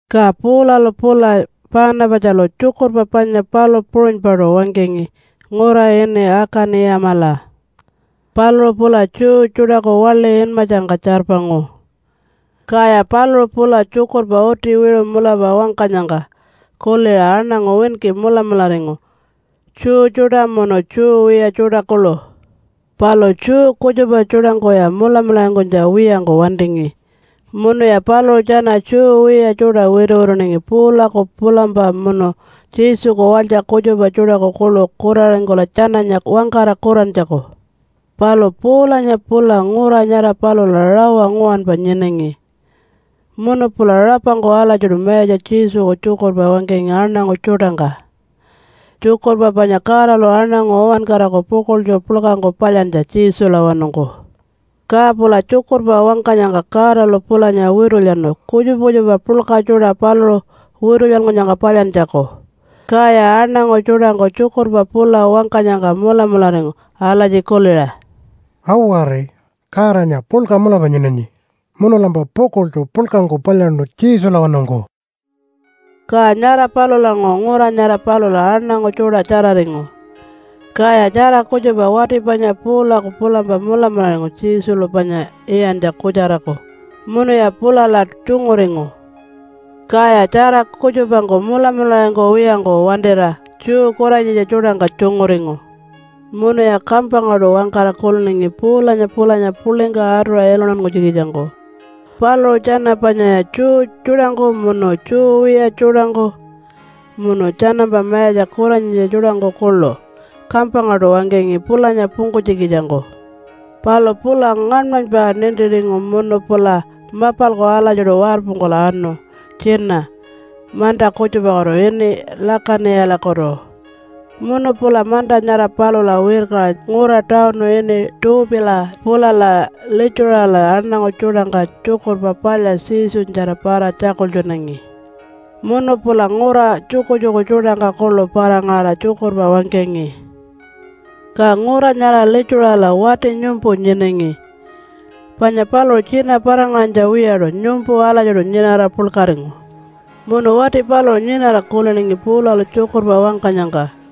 Ka Paulalu pula Paanapatjalu tjukurpa panya palu puṟunypaṯu wangkangi ngura ini Akani-yamala. Paluṟu pula Jew tjuṯaku waḻi inmatjangka tjarpangu, kaya paluṟu pula tjukurpa uti wiṟu mulapa wangkanyangka kuliṟa aṉangu winki mulamularingu Jew tjuṯa munu Jew wiya tjuṯa kuḻu. Palu Jew kutjupa tjuṯangkuya mulamularingkunytja wiyangku wantingi, munuya paluṟu tjana Jew wiya tjuṯa wituwituningi Paulaku pulampa munu Jesuku walytja kutjupa tjuṯaku kuḻu kuraringkula tjananya wangkara kurantjaku. Palu Paulanya pula ngura nyara palula rawa nguwanpa nyinangi, munu pula rapangku alatjiṯu Mayatja Jesuku tjukurpa wangkangi aṉangu tjuṯangka, tjukurpa panya Godalu aṉangu uwankaraku pukuḻtju puḻkangku palyantja Jesulawanungku. Ka pula tjukurpa wangkanyangka Godalu pulanya witulyanu kutjupa kutjupa puḻka tjuṯa paluṟu witulyankunyangka palyantjaku. Kaya aṉangu tjuṯangku tjukurpa pula wangkanyangka mulamularingu alatji kuliṟa, “Awari! Godanya puḻka mulapa nyinanyi, munulampa pukuḻtju puḻkangku palyaṉu Jesulawanungku.” Ka nyara palulanguṟu ngura nyara palula aṉangu tjuṯa tjararingu, kaya tjara kutjupa wati panya Paulaku pulampa mulamularingu Jesulu panya iyantja kutjaraku munuya pulala tjunguringu. Kaya tjara kutjupangku mulamularingkuwiyangku wantira Jew kuranyitja tjuṯangka tjunguringu. Munuya kampangkaṯu wangkara kuliningi Paulanya pulanya puḻingka atuṟa iluntankunytjikitjangku. Paluṟu tjana panyaya Jew tjuṯangku munu Jew wiya tjuṯangku munu tjanampa mayatja kuranyitja tjuṯangku kuḻu kampangkaṯu wangkangi pulanya pungkunytjikitjangku. Palu pula ngaṉmanypa nintiringu munu pula mapalku alatjiṯu warpungkula anu tjina manta kutjupakutu ini Lakaniyalakutu. Munu pula manta nyara palula wirkaṟa ngura tawunu ini Tuupila pulala Litjuṟala aṉangu tjuṯangka Tjukurpa Palya Jesunyatjara para-tjakultjunangi munu pula ngura tjukutjuku tjuṯangka kuḻu para-ngaṟala tjukurpa wangkangi. Ka ngura nyara Litjuṟala wati nyumpu nyinangi, panya paluṟu tjina para-ngaṟanytja wiyaṯu nyumpu alatjiṯu nyinara puḻkaringu. Munu wati paluṟu nyinara kuliningi Paulalu tjukurpa wangkanyangka.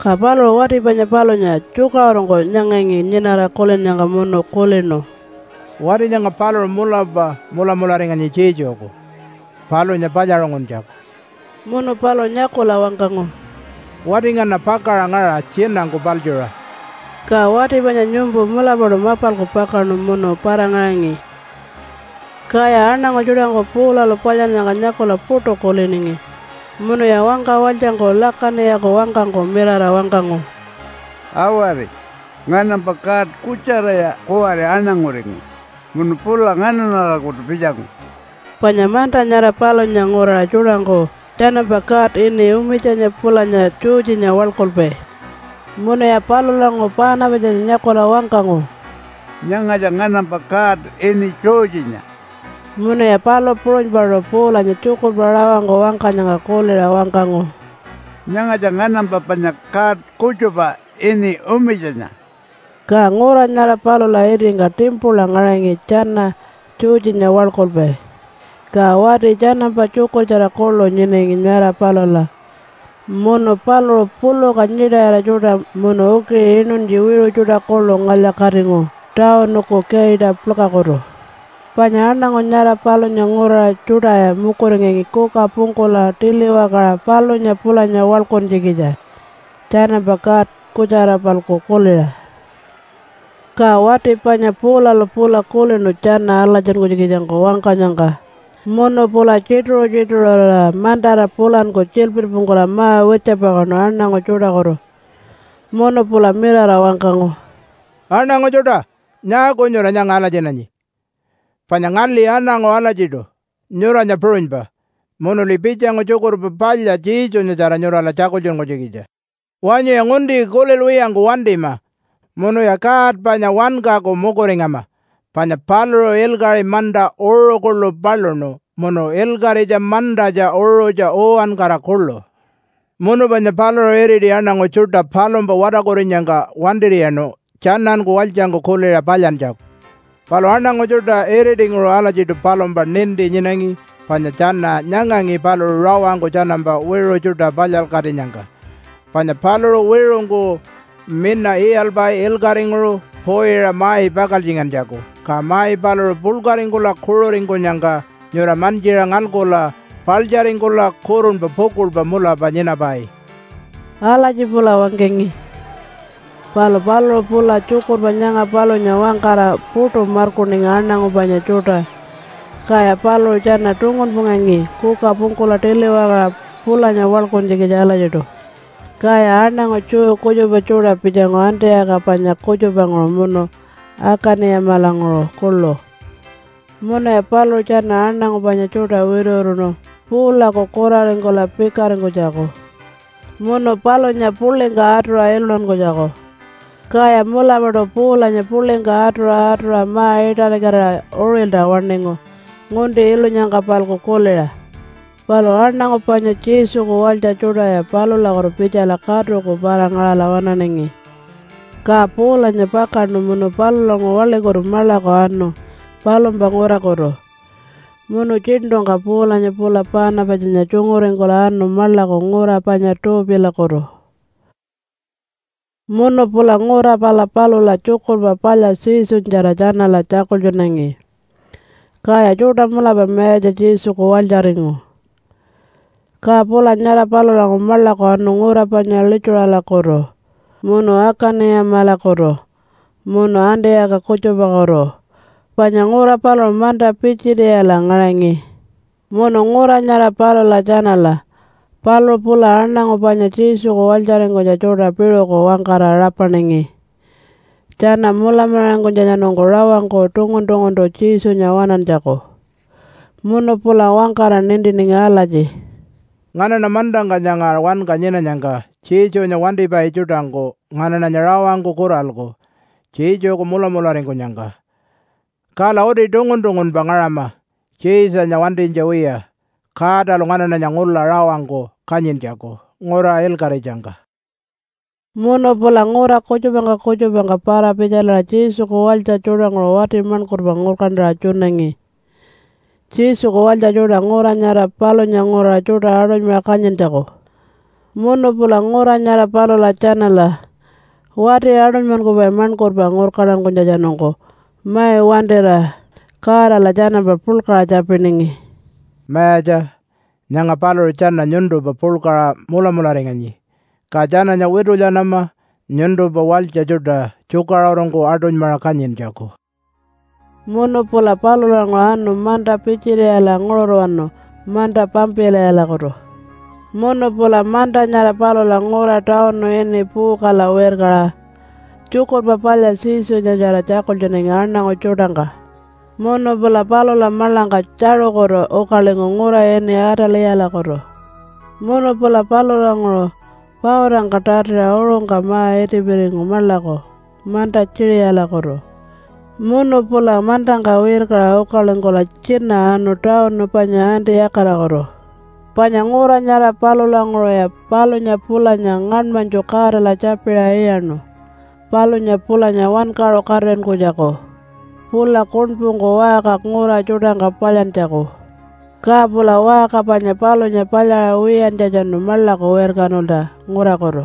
Ka paluṟu wati panya palunya tjukaṟurungku nyangangi nyinara kulinnyangka munu kulinu, “Wati nyanga paluṟu mulapa mulamularinganyi Jesuku palunya palyaṟunguntjaku.” Munu paluṟu nyakula wangkangu, “Wati ngana! Pakaṟa ngaṟa tjinangku paḻtjuṟa!” Ka wati panya nyumpu mulapaṯu mapalku pakaṉu munu para-ngaṟangi. Kaya aṉangu tjuṯangku Paulalu palyannyangka nyakula puṯu kuliningi munuya wangka walytjangku Lakaniyaku wangkangku mirara wangkangu, “Awari! Nganampa god kutjaraya kuwari aṉanguringu munu pula nganaṉalakutu pitjangu.” (Panya manta nyara palunya nguraṟa tjuṯangku tjanampa god ini Umitjanya pulanya Tjuutjinya waḻkulpai.) Munuya palulanguṟu Paanapatjanya nyakula wangkangu, “Nyangatja nganampa god ini Tjuutjinya.” Munuya palu puṟunypaṯu Paulanya tjukurpa rawangku wangkanyangka kuliṟa wangkangu, “Nyangatja nganampa panya god kutjupa ini Umitjanya.” Ka ngura nyara palula itingka timpula ngaṟangi tjana Tjuutjinya waḻkulpai. Ka wati tjanampa tjukurtjara kuḻu nyinangi nyara palula munu paluṟu puluka nyiṯayira tjuṯa munu ukiṟi inuntji wiṟu tjuṯa kuḻu ngalya-katingu tawunuku kaita puḻkakutu, panya aṉangu nyara palunya nguraṟa tjuṯaya mukuringangi kuka pungkula tiliwakaṟa palunya pulanya waḻkuntjikitja tjanampa god kutjara-palku kuliṟa. Ka wati panya Paulalu pula kulinu tjana alatjingantjikitjangku wangkanyangka munu pula tjituṟu-tjituṟurira mantara pulanku tjilpirpungkula ma-wirtjapakaṉu aṉangu tjuṯakutu munu pula mirara wangkangu, “Aṉangu tjuṯa! Nyaaku nyura nyanga alatjinanyi? Panya ngali aṉangu alatjiṯu nyuranya puṟunypa, munuli pitjangu Tjukurpa Palya Jesunyatjara nyurala tjakultjunkunytjikitja. Wanyuya ngunti kulilwiyangku wantima munuya God panya wankaku mukuringama, panya paluṟu ilkaṟi, manta, uṟu kuḻu paluṉu munu ilkaṟitja, mantatja, uṟutja uwankara kuḻu. Munu panya paluṟu iriti aṉangu tjuṯa palumpa watarkurinyangka wantir'iyaṉu tjananku walytjangku kuliṟa palyantjaku. Palu aṉangu tjuṯa iritinguṟu alatjiṯu palumpa ninti nyinangi panya tjana nyangangi paluṟu rawangku tjanampa wiṟu tjuṯa palyalkatinyangka, panya paluṟu wiṟungku mina iyalpai ilkaṟinguṟu puyiṟa mai pakaltjingantjaku, ka mai paluṟu puḻkaringkula kuṟuringkunyangka nyura mantjiṟa ngalkula paḻtjaringkula kurunpa pukuḻpa mulapa nyinapai.” Alatji pula wangkangi. Palu paluṟu pula tjukurpa nyanga palunya wangkara puṯu markuningi aṉangu panya tjuṯa, kaya paluṟu tjana tungunpungangi kuka pungkula tiliwakaṟa pulanya waḻkuntjikitja alatjiṯu. Kaya aṉangu Jew kutjupa tjuṯa pitjangu Antiyaka panya kutjupanguṟu munu Akani-yamalanguṟu kuḻu munuya paluṟu tjana aṉangu panya tjuṯa wituwituṉu Paulaku kuraringkula pikaringkunytjaku munu palunya puḻingka atuṟa iluntankunytjaku. Kaya mulapaṯu Paulanya puḻingka atuṟa atuṟa ma-iṯarikatira uṟilta waṉingu ngunti ilunyangka-palku kuliṟa. Palu aṉangu panya Jesuku walytja tjuṯaya palulakutu pitjala katuku para-ngaṟala waṉaningi, ka Paulanya pakaṉu munu palulanguṟu waḻikutu maḻaku anu palumpa ngurakutu. Munu tjiṉṯungka Paulanya pula Paanapatjanya tjunguringkula anu maḻaku ngura panya Tuupilakutu. Munu pula ngura pala palula Tjukurpa Palya Jesunyatjara tjanala tjakultjunangi, kaya tjuṯa mulapa Mayatja Jesuku walytjaringu. Ka pula nyara palulanguṟu maḻaku anu ngura panya Litjuṟalakutu munu Akani-yamalakutu munu Antiyaka kutjupakutu panya ngura paluṟu manta Pitjitiyala ngaṟangi. Munu ngura nyara palula tjanala, paluṟu pula aṉangu panya Jesuku walytjaringkunytja tjuṯa piṟuku wangkara rapaningi, tjana mulamularingkunytjatjanungku rawangku tungun-tunguntu Jesunya waṉantjaku. Munu pula wangkara nintiningi alatji, “Nganaṉa mantangka nyanga wanka nyinanyangka Jesunya wantipai tjuṯangku nganaṉanya rawangku kuralku Jesuku mulamularingkunyangka, kala uti tungun-tungunpa ngaṟama Jesunya wantinytja wiya Godalu nganaṉanya ngula rawangku kanyintjaku ngura ilkaṟitjangka.” Munu pula ngura kutjupangka kutjupangka para-pitjaliṟa, Jesuku walytja tjuṯanguṟu wati maṉkurpa ngurkantaṟa tjunangi, Jesuku walytja tjuṯa ngura nyara palunya nguraṟa tjuṯa aṯunymaṟa kanyintjaku. Munu pula ngura nyara palula tjanala, wati aṯunymankupai maṉkurpa ngurkantankunytjatjanungku mai wantira, Godala tjanampa puḻkaṟa tjapiningi, “Mayatja! Nyanga paluṟu tjana nyuntumpa puḻkaṟa mulamularinganyi, ka tjananya witulyanama nyuntumpa walytja tjuṯa tjukaṟurungku aṯunymaṟa kanyintjaku.” Munu pula palulanguṟu anu manta Pitjitiyala nguṟurwanu manta Pampiliyalakutu. Munu pula manta nyara palula ngura tawunu ini Puukala wirkaṟa Tjukurpa Palya Jesunyatjara tjakultjunangi aṉangu tjuṯangka. Munu pula palula maḻangka tjaṟukutu ukalingu ngura ini Ataliyalakutu. Munu pula palulanguṟu pautangka tatiṟa uṟungka ma-itipiringu maḻaku manta Tjiṟiyalakutu munu pula mantangka wirkaṟa ukalingkula tjina anu tawunu panya Antiyakalakutu. Panya ngura nyara palulanguṟuya palunya pulanya ngaṉmanytju Godala tjapiṟa iyaṉu, palunya pulanya wankaṟu katiṟinkunytjaku, pula kuṉpungku waṟka ngura tjuṯangka palyantjaku. Ka pula waṟka panya palunya palyaṟa wiyantjatjanu maḻaku wirkanulta ngurakutu.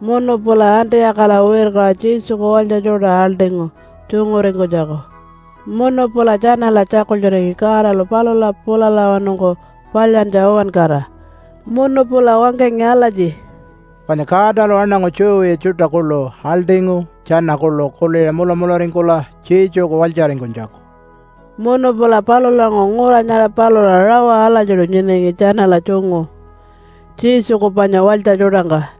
Munu pula Antiyakala wirkaṟa Jesuku walytja tjuṯa aḻṯingu tjunguringkunytjaku munu pula tjanala tjakultjunangi Godalu palula pulalawanungku palyantja uwankara. Munu pula wangkangi alatji, “Panya Godalu aṉangu Jew wiya tjuṯa kuḻu aḻṯingu tjana kuḻu kuliṟa mulamularingkula Jesuku walytjaringkunytjaku.” Munu pula palulanguṟu ngura nyara palula rawa alatjiṯu nyinangi tjanala tjungu, Jesuku panya walytja tjuṯangka.